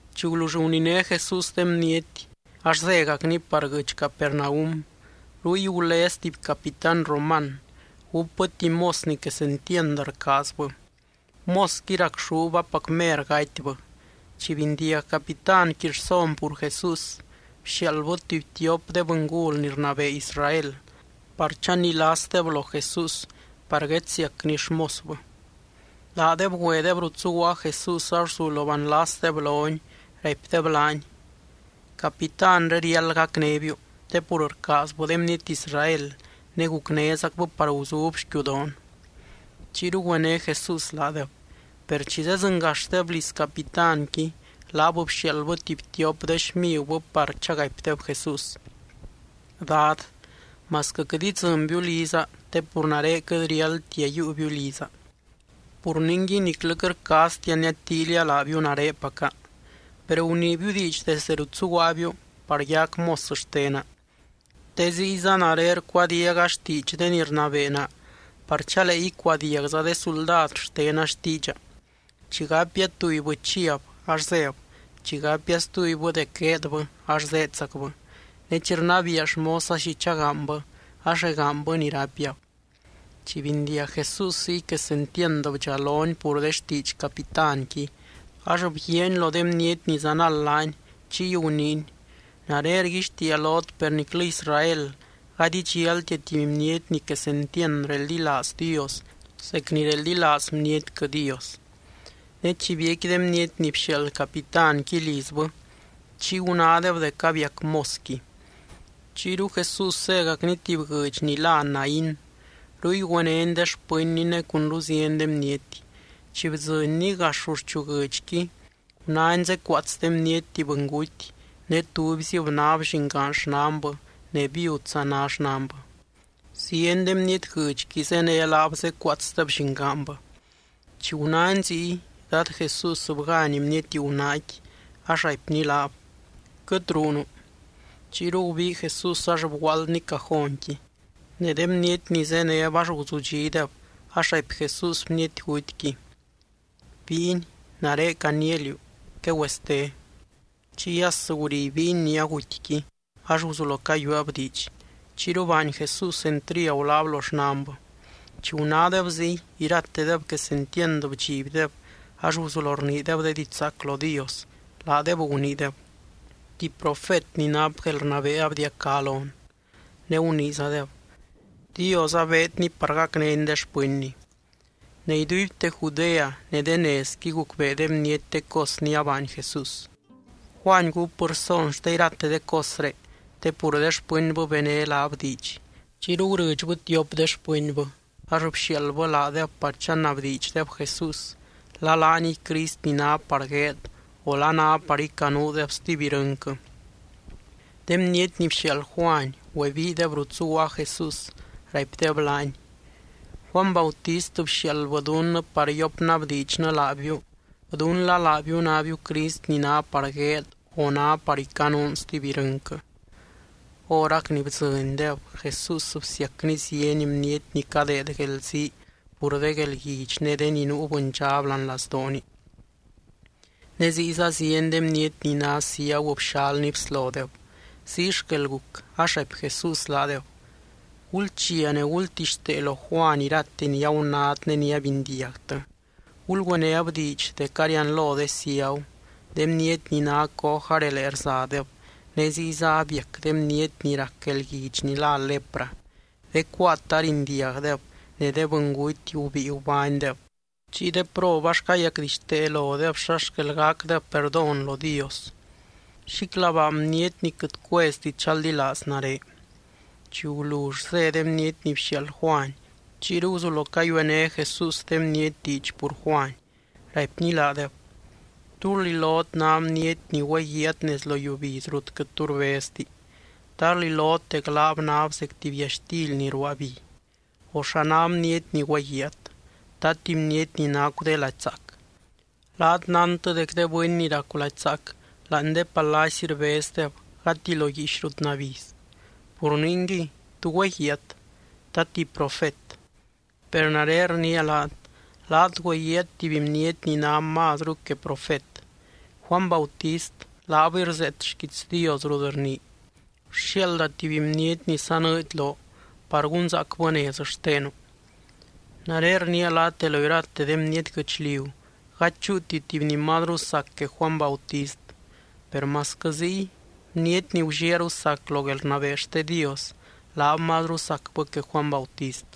Chi gulull guniné Jesús de bniety, ax zégacny par guɨdx Capernaum. Ruy gulez tuby capitán roman. Gúpbɨ tuby mos ni quesentiand rcaazbɨ. Mosqui racxúb apac mer gatybɨ. Chi bindiag capitánqui rson pur Jesús, bxiaaldbɨ tuby tiop de bɨngul ni rnabee Israel par chanilasdeb lo Jesús par guedsiacny xmosbɨ. Laadeb güedeb rut zuguaa Jesús ax guzulo banlasdeb lony, raipdeb laany: —Capitánre riáld gacnébiu te pur rcaazbɨ de bniety Israel ne gucnézacbɨ par guzub xquiudoon. Chiyru güené Jesús laadeb. Per chi zedzɨngaxdeb liz capitánqui, laab bxiaaldbɨ tuby tiop de xmigubɨ par chagaipdeb Jesús: —Dad, masquɨ quɨt idzɨnbiu liza te pur nare quɨt riáldtia yiiubiu liza. Pur ningui, niclɨ quɨt rcaaztia niadtíilia laabiu narepaca. Per guniibiu diidx desdɨ rut zuguaabiu par yac mos xtena. Te ziyza nare rcuadiaga xtiidx de ni rnabee naa par chalee icuadiagza de suldad xtena xtiidxa. Chi gapia tubybɨ, chiab, ax zéb. Chi gapia stubybɨ dec gueedbɨ ax zéedzacbɨ. Ne chi rnabiia xmosa xi chagaanybɨ, ax regaanybɨ ni rapiab. Chi bindiag Jesús ziy, quesentiand bdxalony pur de xtiidx capitánqui ax bguiaany lo de bniety ni zanald laany, chiy guniiny: —Nare rguixtiia lot per niclɨ Israel gady idxialtia tuby bniety ni quesentiand reldilaaz Dios zec ni reldilaaz bnietquɨ Dios. Ne chi biecqui de bniety ni bxiaald capitánqui lizbɨ, chiy gunádeb dec abiac mosqui. Chiyru Jesús zégacny tuby guɨdx ni lá Naín. Ruy güenény ne xpɨnny ne cunru zieny de bniety. Chi bdzɨnny gax ruxchu guɨdxqui, gunány zécuaats de bniety tuby bɨnguty ne tubyzib náb llingaan xnanbɨ ne viudza ná xnanbɨ. Zieny de bniety guɨdxqui zéne laab zécuaatsdeb llingaanbɨ. Chi gunány ziy, Dad Jesús bgány bniety gunaaqui ax raipny laab: —Quɨt ruunu. Chiyru gubii Jesús ax bguaaldny cajónqui. Ne de bniety ni zéneb ax guzudxídeb ax raipy Jesús bniety gutyqui: —Bíiny, nare caniia liú: ¡Quegüeste! Chiy as guri bíiny ni agutyqui ax guzulo cayueeb diidx. Chiyru baany Jesús entriagu laab lo xnanbɨ. Chi gunádeb ziy, iratedeb quesentiand bdxibdeb ax guzulo rniideb de diidx zaac lo Dios, laadeb guniideb: —Tuby profet ni nap guelrnabee abdiacá lon. Ne guniizadeb: —Dios abeedny par gacnény de xpɨnny. Ne iduibte Judea, ne de nezqui gucbee de bniety de cos ni abaany Jesús. Juany gúpbɨ rson xte irate de cosré te pur de xpɨnbɨ bené laab diidx. Chiyru gurɨdxbɨ tiop de xpɨnbɨ ax bxiaaldbɨ laadeb par chanabdiidxdeb Jesús la laaniy Crist ni ná par gueed o la ná par icanuudeb stuby irɨnquɨ. De bniety ni bxiaald Juany güebiideb rut zuguaa Jesús, raipdeb laany: —Juany Bautist bxiaaldbɨ dunnɨ par yopnabdiidxnɨ laabiu dún la laabiu nábiu Crist ni ná par gueed, o ná par icanuun stuby irɨnquɨ. Horac ni bdzɨndeb, Jesús bsiacny zieny bniety ni cadeed guelzii pur de guelguidx ne de ni nuu bɨndxab láani lazdooni, ne ziyza zieny de bniety ni ná ciagu bxalny bslodeb. Ziy xquel guc ax raipy Jesús laadeb: —Gulchia ne gultixtee lo Juany irate ni agunát ne ni abindiagtɨ. Gulgüenéb diidx dec arianlo de ciagu, de bniety ni ná coj arelee rzadeb, ne ziyza abiac de bniety ni rac guelguidx ni lá lepra, de cuaat arindiagdeb, ne de bɨnguty gubíi gubánydeb, chiy de prob ax cayacdixtee lodeb xa xquel gacdeb perdón lo Dios. Xíclabaa bniety ni quɨt cuezti chaldilaaz nare. Chi gulull zé de bniety ni bxiaald Juany, chiyru guzulo cayuené Jesús de bniety diidx pur Juany, raipny laadeb: —¿Tú rlilot ná bniety ni güeguiaat nez lo yiubiz rut quɨt tu rbezti? ¿Ta rlilot dec laab náb zec tuby yaxtily ni ruaa bi? O, ¿xa ná bniety ni güeguiaat? ¿Ta tuby bniety ni nacu de lady zaac? Laat nántɨ dec de bɨny ni racu lady zaac láani de palacy rbezdeb gati lo guiix rut nabiz. Pur ningui, ¿tú güeguiaat? ¿Ta tuby profet? Per nare rniia laat, laat güeguíat tuby bniety ni ná mazru que profet. Juany Bautist laabɨy rzeet xquiits Dios rut rnii: Rxiaalda tuby bniety ni sanɨɨdy loo par gunzaacbɨ nez xtenu. Nare rniia laat de lo irate de bniety guɨchliu gady chúuti tuby ni mazru sac que Juany Bautist. Per masquɨ ziy, bniety ni gulliaaru sac lo guelrnabee xte Dios, laab mazru sacbɨ que Juany Bautist.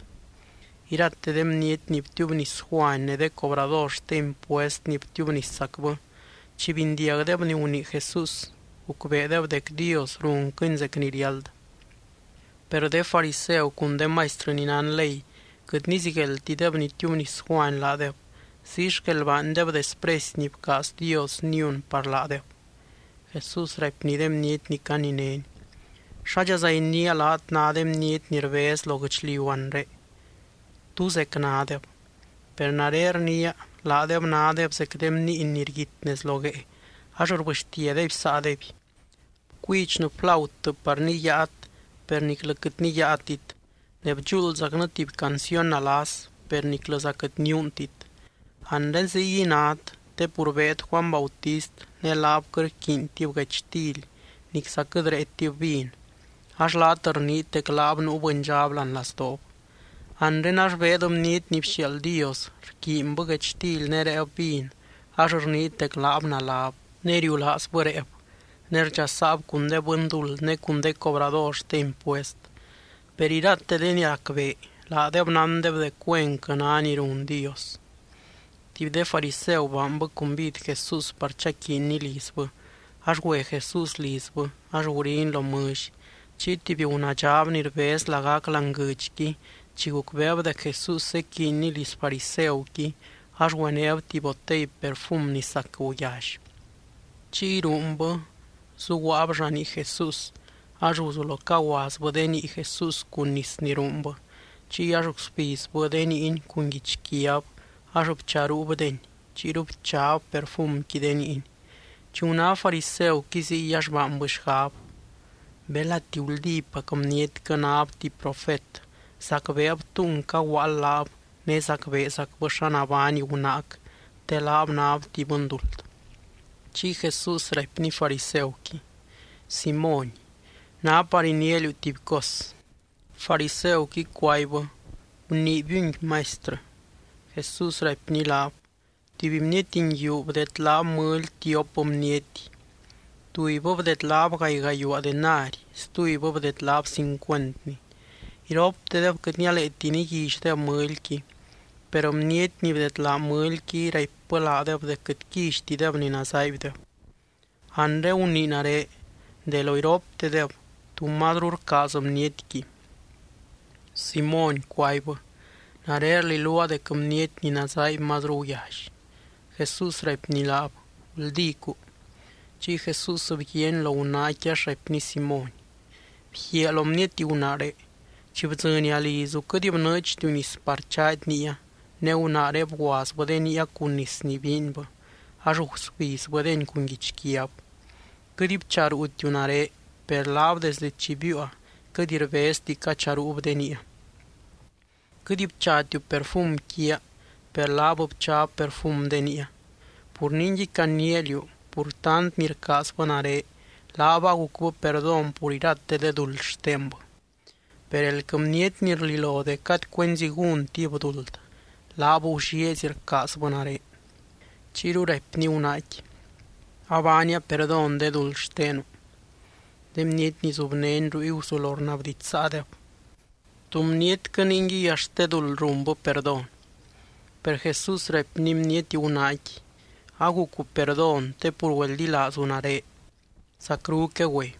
Irate de bniety ni btiubnis Juany ne de cobrador xte impuest ni btiubniszacbɨ, chi bindiagdeb ni gunii Jesús, gucbeedeb dec Dios runquɨny zec ni riáld. Per de fariseu cun de maistrɨ ni nán ley, quɨt nizigueldtideb nitiubnis Juany laadeb, ziy xquel baandeb despresy ni bcaaz Dios niun par laadeb. Jesús raipny de bniety ni caninény: —¿Xádxaza iniia laat ná de bniety ni rbez lo guɨchliu anre? ¿Tú zec nádeb? Per nare rniia, laadeb nádeb zec de bniiny ni rguit nez lo guee ax rbɨxtiadeby saadeby: “Bcuidxnɨ flautɨ par niyaat, per niclɨ quɨt niyaatit. Ne bdxuuldzacnɨ tuby canciony nalas, per niclɨza quɨt niuuntit.” Anre ziguiy nát te pur beed Juany Bautist ne laab quɨt rquiintib guechtily nicza quɨt réetib vin, ax laat rniit dec laab nuu bɨndxab láani lazdoob. Anre ax beed Bniety ni bxiaald Dios rquiinbɨ guechtily ne réeb vin ax rniit dec laab naláb, ne riulaazbɨ réeb, ne rdxasaab cun de bɨnduld ne cun de cobrador xte impuest. Per irate de ni racbee, laadeb nándeb dec güenquɨ ná ni run Dios. Tuby de fariseu baanbɨ cumbid Jesús par chaquiinny lizbɨ, ax güe Jesús lizbɨ ax guriny lo mɨlly. Chiy tuby gunaadxab ni rbez lagac láani guɨdxqui chi gucbeeb dec Jesús zequiiny liz fariseuqui ax güenéb tuby botey perfum ni sac guyally. Chiy ruunbɨ zuguaab llanii Jesús ax guzulo caguazbɨ de nii Jesús cun nis ni ruunbɨ. Chiy ax gusbizbɨ de niiny cun guichquiab ax bcharuubdeny chiyru bchab perfumqui de niiny. Chi guná fariseuqui ziy, ax baanbɨ xgab: “Belati guldípac bnietquɨ náb tuby profet, zacbeeb túng caguaald laab ne zacbeezacbɨ xa nabány gunaac, te laab náb tuby bɨnduld.” Chiy Jesús raipny fariseuqui: —Simóny, ná par iniia liú tuby cos. Fariseuqui cuaibbɨ: —Guniibiungui, Maistrɨ. Jesús raipny laab: —Tuby bniety nguiu bdedlaab mɨly tiop bniety. Tubybɨ bdedlaab gaay gayuaa denari. Stubybɨ bdedlaab cincuentni. Iroptedeb quɨt nialeeti niguillydeb mɨlyqui, per bniety ni bdedlaa mɨlyqui raipbɨ laadeb dec quɨt quillytideb ni nazaaibdeb. Anre gunii nare, de lo iroptedeb, ¿tú mazru rcaaz bnietqui? Simóny cuaibbɨ: —Nare rliluaa dec bniety ni nazaaiby mazru guyally. Jesús raipny laab: —Guldícu. Chiy Jesús bguiaany lo gunaaqui ax raipny Simóny: —Bguiaa lo bniety gunaaré. Chi bdzɨnia lizu quɨt bnɨɨdxtiu nis par chaady niia ne gunaaré bguazbɨ de niia cun nis ni biinbɨ, ax gusbizbɨdeny cun guichquiab. Quɨt bcharuutiu nare, per laab desde chi biiua, quɨt rbezti cacharuub de niia. Quɨt bchatiu perfum quiaa, per laab bchab perfum de niia. Pur ningui, caniia liú pur tant ni rcaazbɨ nare, laab agucbɨ perdón pur irate de duld xtenbɨ. Per elquɨ bniety ni rlilo dec gady cuenzi gúntib duld, laab gullieezy rcaazbɨ nare. Chiyru raipny gunaaqui: —Abaania perdón de duld xtenu. De bniety ni zubnény ruy guzulo rnabdidxsaadeb: —¿Tú bnietquɨ ningui axt de duld runbɨ perdón? Per Jesús raipny bniety gunaaqui: —Agucu perdón te pur güeldilaazu nare. Zacru quegüe.